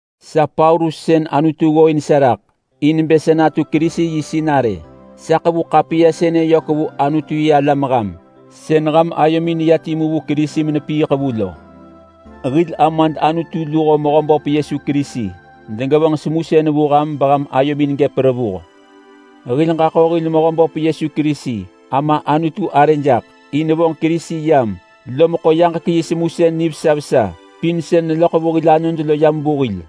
Sa Paulus sën Anutu ggooin sa raḳ in bë sa natu Kerisi yi sinarë. Sa ḳevu ḳapiya sënë yök vu Anutu-yi-alam ham sën ham ayomin neya timu vu Kerisi menepiiḳ vu lo. Hil Amad Anutu luho Mehöböp Yesu Kerisi degevonġ semusën vu ham beham ayomin gëp revuh. Hil ġaḳo hil Mehöböp Yesu Kerisi Ama Anutu arë jaḳ in vonġ Kerisi yam, lom ḳo yaġek yi semusën nivesa vesa pin sën neloḳ vu hil anod lo yam vu hil.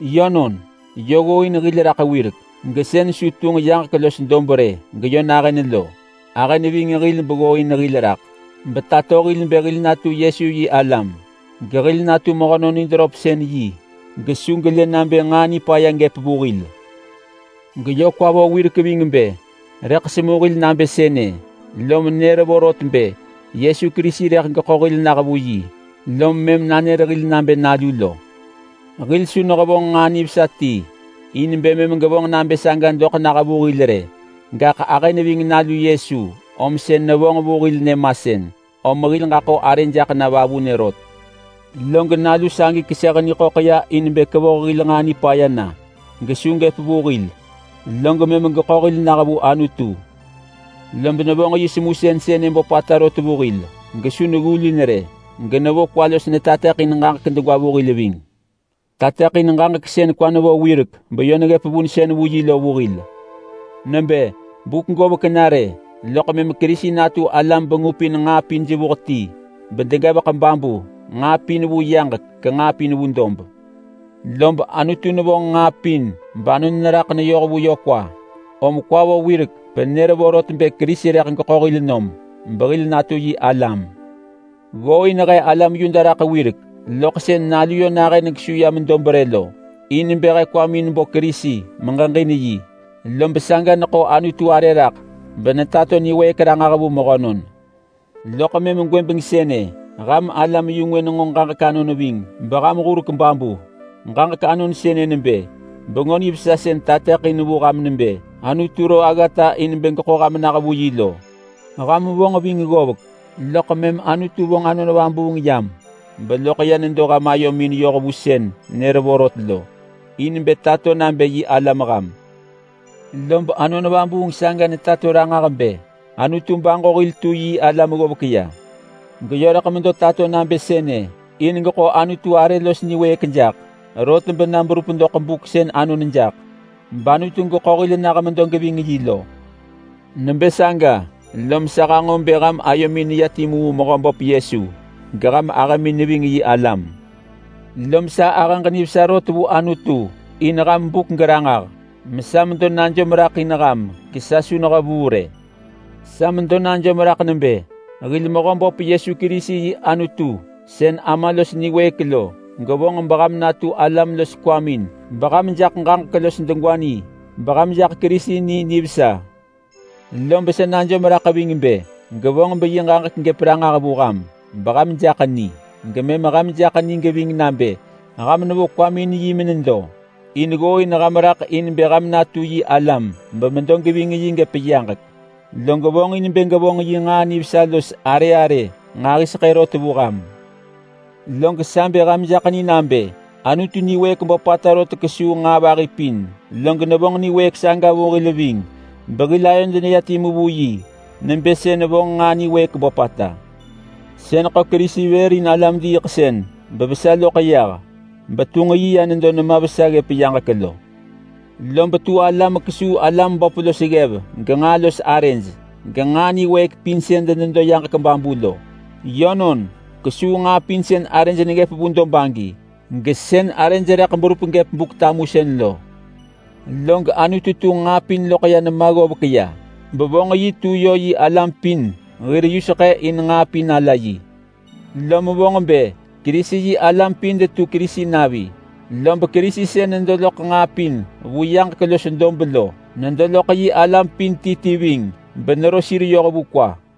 Yönon, yö ggooin hil raḳ wirek gesën su tunġ yaġek los dob rë geyö nahën lo. Ahë neving hil beggooin hil raḳ betato hil bë hil natu Yesu yi alam gehil natu mehönon nid röpsën, gesu gelë nabë nġaa nipaya gëp vu hil. Geyö kwa vo wirek ving bë rëḳ semu hil nabë sënë, lom nër vorot bë Yesu Kerisi rëḳ geḳo hil nah vu yi lom mëm nanër hil nabë nalu hil. Hil su nehevonġ nġaa nivesa ti in bë mëm gevonġ nabë saga doḳ nah vu hil rë, gaḳ ahë neving Nalu Yesu om sën nevonġ vu hil nyëmasën, om hil ġaḳo arë jaḳ na vavunë rot. Log Nalu sagi keseh niḳöḳ ya in bë kevoh hil nġaa nipaya na gesu gëp vu hil, log mëm geḳo hil nah vu Anutu. Lob nevonġ yi semusën sënë böpata rot vu hil gesu neggulin rë. Genevo kwa los netateḳin ġaġek degwa vu hil ving. Tateḳin ġaġek sën kwa nevo wirek beyö neggëp vunsën vu yi lo vu hil. Nebë, buk govek na rë, loḳ mëm Kerisi natu ala bengupin nġaa pin jevuh ti bedegevek babu. Nġaa pin vu yaġek genġaa pin vu dob. Lob Anutu nevonġ nġaa pin banon neraḳ neyoh vu yö kwa, om kwa vo wirek benër vorot bë Kerisi rëḳ geḳo hil nom behil natu yi alam. Ggooin he alam Yuda raḳ wirek loḳ sën Nalu yö nahën gesu yam dob rë lo, in bë he kwamin bo Kerisi megeġin yi. Lob saga neḳo Anutu arë raḳ benetato niwëëk ranġah vu mehönon. Loḳ mëm gwëbeng sënë ham alam-yu-ngwë nenġo ġaġek anon ving beham hurek babu. Ġaġek anon sënë nebë Bengö Nivesa sën tateḳin vu ham nebë Anutu ro aggata in bë geḳo ham nah vu yi lo. Ham vonġ ving ggovek, loḳ mëm Anutu vonġ Anon Vabuung yam beloḳ ya nedo ham ayomin yoh vu sën nër vorot lo, in bë tato nabë yi alam ham. Lob Anon Vabuung saga netato ranġah bë Anutu baġo hil tu yi alam ggovek ya. Geyö rëḳ medo tato nabë sënë in geḳo Anutu arë los niwëëk jaḳ. Rot bena berup doḳ buk sën anon jaḳ bAnutu geḳo hil nah medo geving yi lo. Nebë saga lom sa hanġo bë ham ayomin neya timu vu Mehöböp Yesu geham ahëmin neving yi alam. Lom sa ahëġ nivesa rot vu Anutu in ham buk geranġah, mesa medo najom raḳ in ham gesa su nehevuu rë. Sa medo najom raḳ nebë hil Mehöböp Yesu Kerisi yi Anutu sën Ama los niwëëk lo gevonġ beham natu alam los kwamin beham jaḳ ġaġek los degwa ni beham jaḳ Kerisi ni nivesa. Lob sa najom raḳ ving bë gevonġ beyi ġaġek gëp ranġah vu ham beham jaḳ ni, gemëm ham jaḳ ni geving nabë ham nevo kwamin in yi menedo. In ggooin ham raḳ in bë ham natu yi alam bemedo geving yi gëp yaġek. Log vonġin bë gevonġ yi nġaa nivesa los arë arë nġahiseḳë rot vu ham. Log sa bë ham jaḳ ni nabë Anutu niwëëk böpata rot kesuu nġaa vahi pin, log nevonġ niwëëk saga vu hil ving behil ayod neya timu vu yi. Nebë sën vonġ nġaa niwëëk böpata sën ḳo Kerisi vër in alam-diiḳsën bevesa loḳ yah, betunġ yi ya nedo nema vesa ggëp yaġek lo. Lob tu ala mekesuu alam böp los ggev genġaa los arëj, genġaa niwëëk pin sën denedo yaġek babu lo. Yönon, kesuu nġaa pin sën arëj neggëp vu dob agi, gesën arëj rëḳ berup gëp Buk-tamusën lo. Log Anutu tunġ nġaa pin loḳ ya nema ggovek ya bevonġ tu Kerisi-yi-alam pin hir yuseḳë in nġaa pin ala yi. Lom vonġ bë Kerisi-yi-alam pin detu Kerisi navi, lob Kerisi sën nedo loḳ nġaa pin vu yaġek los dob lo nedo loḳ yi alam pin ti ti ving benero sir yoh vu kwa.